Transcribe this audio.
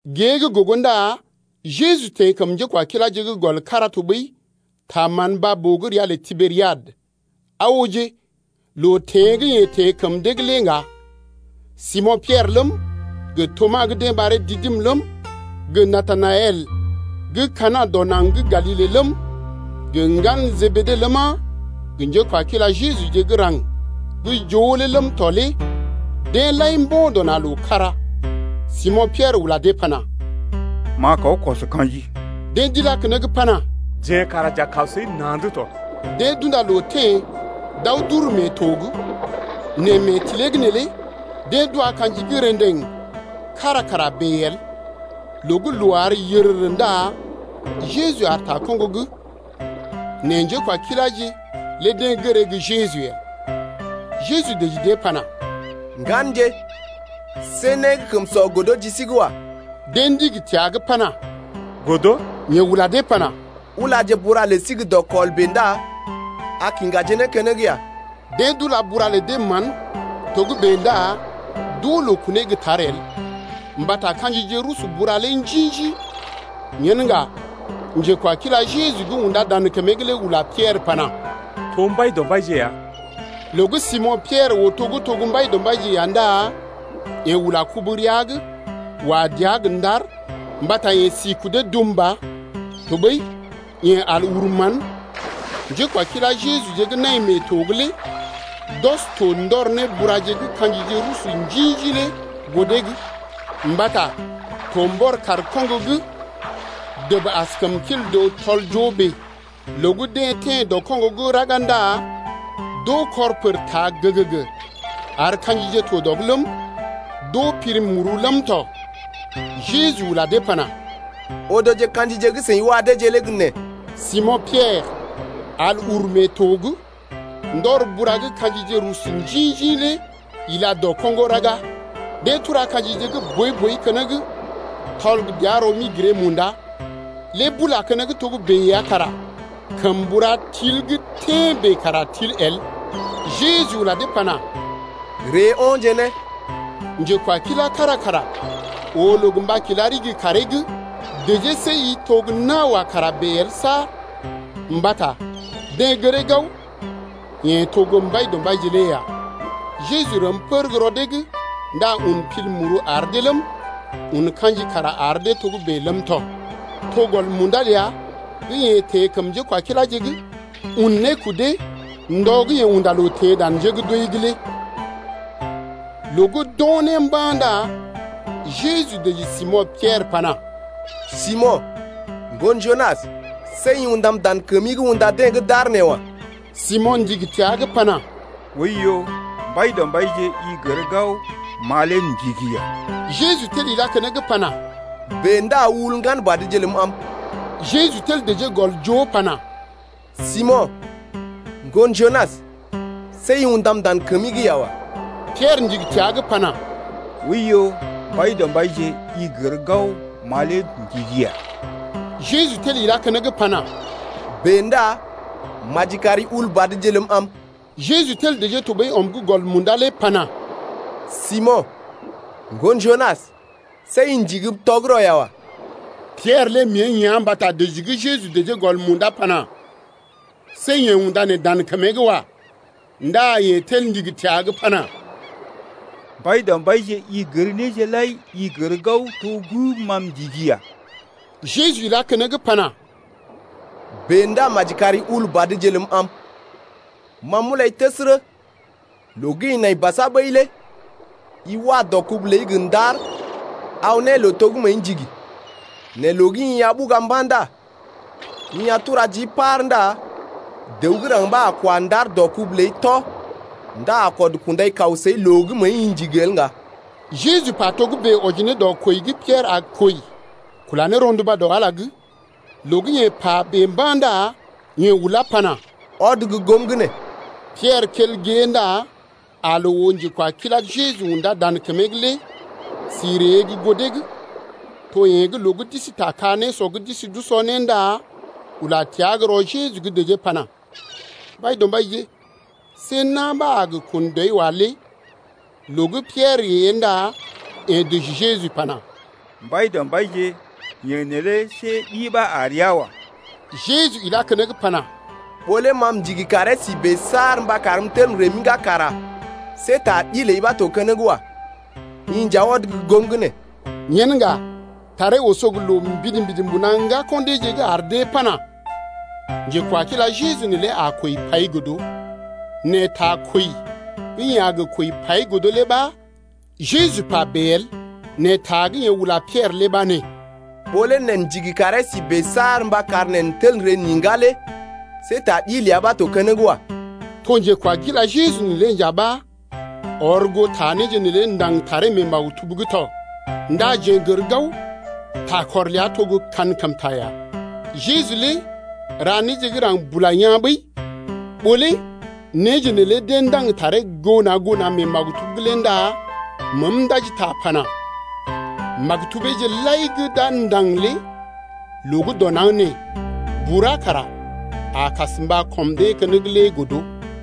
Gée gə́ gogo ndá Jeju teḛ kəm njékwakiláje’g gɔl kára tɔɓəi ta mán baa-boo gə́ ria lə Tiberiad. Aa ooje, loo teḛ gə́ yeḛ teḛ kəm dee’g lé ŋga. Simo̰ Piɛrə ləm, gə Tomas gə́ deḛ ɓaree Didim ləm, gə Natanaɛl gə́ Kana dɔ naŋg gə́ Galile ləm, gə ŋgalə Jebede ləma, gə njékwakila Jejuje gə́ raŋg gə́ joo lé ləm tɔ lé deḛ lai mbo̰ dɔ na̰ loo kára. Simo̰ Piɛrə ula dee pana: M’a kaw kɔs ka̰ji. Deḛ d’ilá keneŋ pana: Jeḛ kara j’a kaw səi na̰’d tɔ. Deḛ d’unda loo teḛ d’aw d’uru mee to’g nɛ mee tilee’g neelé deḛ d’wa ka̰ji gə́ rḛdeŋ kára kara bèe el. Loo gə́ loo àr yərərə ndá Jeju aar ta koŋgo’g. Nɛ njékwakiláje lé deḛ gəree gə́ Jeju lé el. Jeju dəji dee pana: Ŋganje, see né gə́ kəm sɔ godo ji sí’g wa. Deḛ ndigi təa’g pana: Godo. Yeḛ ula dee pana: Ulaje bura lə sí gə́ kel dɔkɔl bèe ndá a kiŋgaje né keneŋ ya. Deḛ d’ila bura lə dee mán togə́bè ndá d’oo loo kunee gə́ tar el mbata ka̰jije rusu bura lé njḭ-njḭ. Yen ŋga njekwakilá gə́ Jeju undá dan kəmee’g lé ula Piɛrə pana: To Mbaidɔmbaije ya. Loo gə́ Simo̰ Piɛrə oo to gə́ to gə́ Mbaidɔmbaije ya ndá yeḛ ula kubu rəa’g wa dəa gə ndar mbata yeḛ si kudee dum ba, tɔɓəi yeḛ ɔd al uru mán. Njékwakila Jejuje gə́ nai mee to’g lé d’ɔs to ndɔr ne bura gə́ ka̰jije rusu njḭ-njḭ lé goo dee’g, mbata to mbɔr kaar koŋgo’g dəb as kəmkil dəw tɔl-joo bèe. Loo gə́ deḛ teḛ dɔ koŋgo raga ndá d’oo kɔr pər taa gəgəgə ar ka̰jije to dɔ’g ləm, d’oo pil muru ləm tɔ. Jeju ula dee pana: Odoje ka̰jije gə́ seḭ wa deeje lé gə́ nee. Simo̰ Piɛrə al uru mee to’g, ndɔr bura gə́ ka̰jije rusu njḭ-njḭ lé ila dɔ koŋgo raga. Deḛ tura ka̰jije gə́ boi-boi keneŋ tɔl gə dəa rɔ-mi-giree-munda, lé bula keneŋ togə́bè ya kara kəm bura til gə́ tḛ́ bèe kara til el. Jeju ula dee pana: Ree o̰je né. Njekwakilá kára kara oo loo gə mba kila ɗigi kaaree’g dəjee, see i to gə́ nawa kara bèe el saar, mbata deḛ gəree gao yeḛ to gə́ Mbaidɔmbaije lé ya. Jeju rəm pər gə́ rɔ dee’g ndá un pil muru ar dee ləm, un ka̰ji kara ar dee togə́bè ləm tɔ. To gɔl munda ləa gə́ yeḛ teḛ kəm njékwakiláje’g un ne kudee ndɔ gə́ yeḛ unda loo teḛ dan njé gə́ d’wəi’g lé. Loo gə́ d’o̰ né mba̰ ndá Jeju dəji Simo̰ Piɛrə pana: Simo̰, ŋgon Junas, see i undam dan kəmi’g unda deḛ gə́ d’aar nee wa. Simo̰ ndigi təa’g pana: Oiyo, Mbaidɔmbaije, i gər gao, ma lé m’ndigi ya. Jeju tel ilá keneŋ pana: Bèe ndá ul ŋgan badje ləm am. Jeju tel dəjee gɔl joo pana: Simo̰, ŋgon Junas, see i undam dan kəmi’g ya wa. Piɛrə ndigi təa’g pana: Oiyo, Mbaidɔmbaije, i gər gao ma lé m’ndigii ya. Jeju tel ilá keneŋ pana: Bèe ndá maji kari ula badje ləm am. Jeju tel dəjee tɔɓəi ɔm’g gɔl munda lé pana: Simo̰, ŋgon Junas, see i ndigim tɔgərɔ ya wa. Piɛrə lé mée ea̰ mbata dəji gə́ Jeju dəjee gɔl munda pana: See yeḛ undá dan kəmee’g wa. Ndá yeḛ tel ndigi təa’g pana: Mbaidɔmbaije, i gər néje lai, i gər gao to gə́ ma m’ndigii ya. Jeju ilá keneŋ pana: Bèe ndá maji kari ul badje ləm am. Ma m’ulai təsərə, loo gə́ i nai basa ɓəi lé i wa dɔ kubu ləi gə ndar aw ne loo to gə́ məəi ndigi. Nɛ loo gə́ i a ɓuga mba̰ ndá i a tura jii par ndá dəw gə́ raŋg ɓa a kwa ndar dɔ kubu ləi tɔ ndá a kɔd kundai kaw səi loo gə́ məəi ndigi’g el ŋga. Jeju pa togə́bè wɔji ne dɔ kwəi gə́ Piɛrə a kwəi kula ne rɔnduba dɔ Ala’g lé. Loo gə́ yeḛ pa bèe mba̰ ndá yeḛ ulá pana: Ɔd gə́ goom’g nee. Piɛrə kel gée ndá aa loo oo njekwakilá gə́ Jeju undá dan kəmee’g lé si ree gə́ goo dee’g, to yeḛ gə́ loo gə́ d’isi ta ka-nésɔ’g d’isi d’usɔ né ndá ula təa gə́ rɔ Jeju’g dəjee pana: Mbaidɔmbaije, see na̰ ɓa a kun dɔi wa lé. Loo gə́ Piɛrə ée ndá yeḛ dəji Jeju pana: Mbaidɔmbaije, yeḛ neelé see ɗi ɓa a rəa wa. Jeju ilá keneŋ pana: Ɓó lé ma m’ndigi karee si bèe saar mba karm m’tel m’iŋgá kara see ta ɗi ləi ɓa to keneŋ wa. I nja ɔd gə́ goom’g nee. Yen ŋga taree oso gə loo mbidi-mbidi mbuna ŋgako̰ deeje’g ar dee pana: Njekwakila Jeju neelé a kwəi pai godo. Nɛ ta kwəi gə́ yeḛ a kwəi pai godo lé ɓa Jeju pa bèe el, nɛ ta gə́ yeḛ ula Piɛrə lé ɓa nee: Ɓó lé neḛ ndigi karee si bèe saar mba kar neḛ n’tel n’ree n’iŋgá lé see ta ɗi ləa ɓa to keneŋ wa. To njekwakila Jeju neelé nja ɓa ɔr goo ta néje neelé ndaŋg taree mee maktub’g tɔ. Ndá jeḛ n’gər gao, takɔr ləa to gə́ kankəmta ya. Jeju lé ra néje gə́ raŋg bula yaa̰ ɓəi, ɓó lé néje neelé deḛ ndaŋg taree goo na̰ goo na̰ mee maktub’g lé ndá məəm ndaji ta pana: Maktubeeje lai gə́ d’a ndaŋg lé loo gə́ dɔ naŋg nee bura kara a kas mba kɔm dee keneŋ lé godo.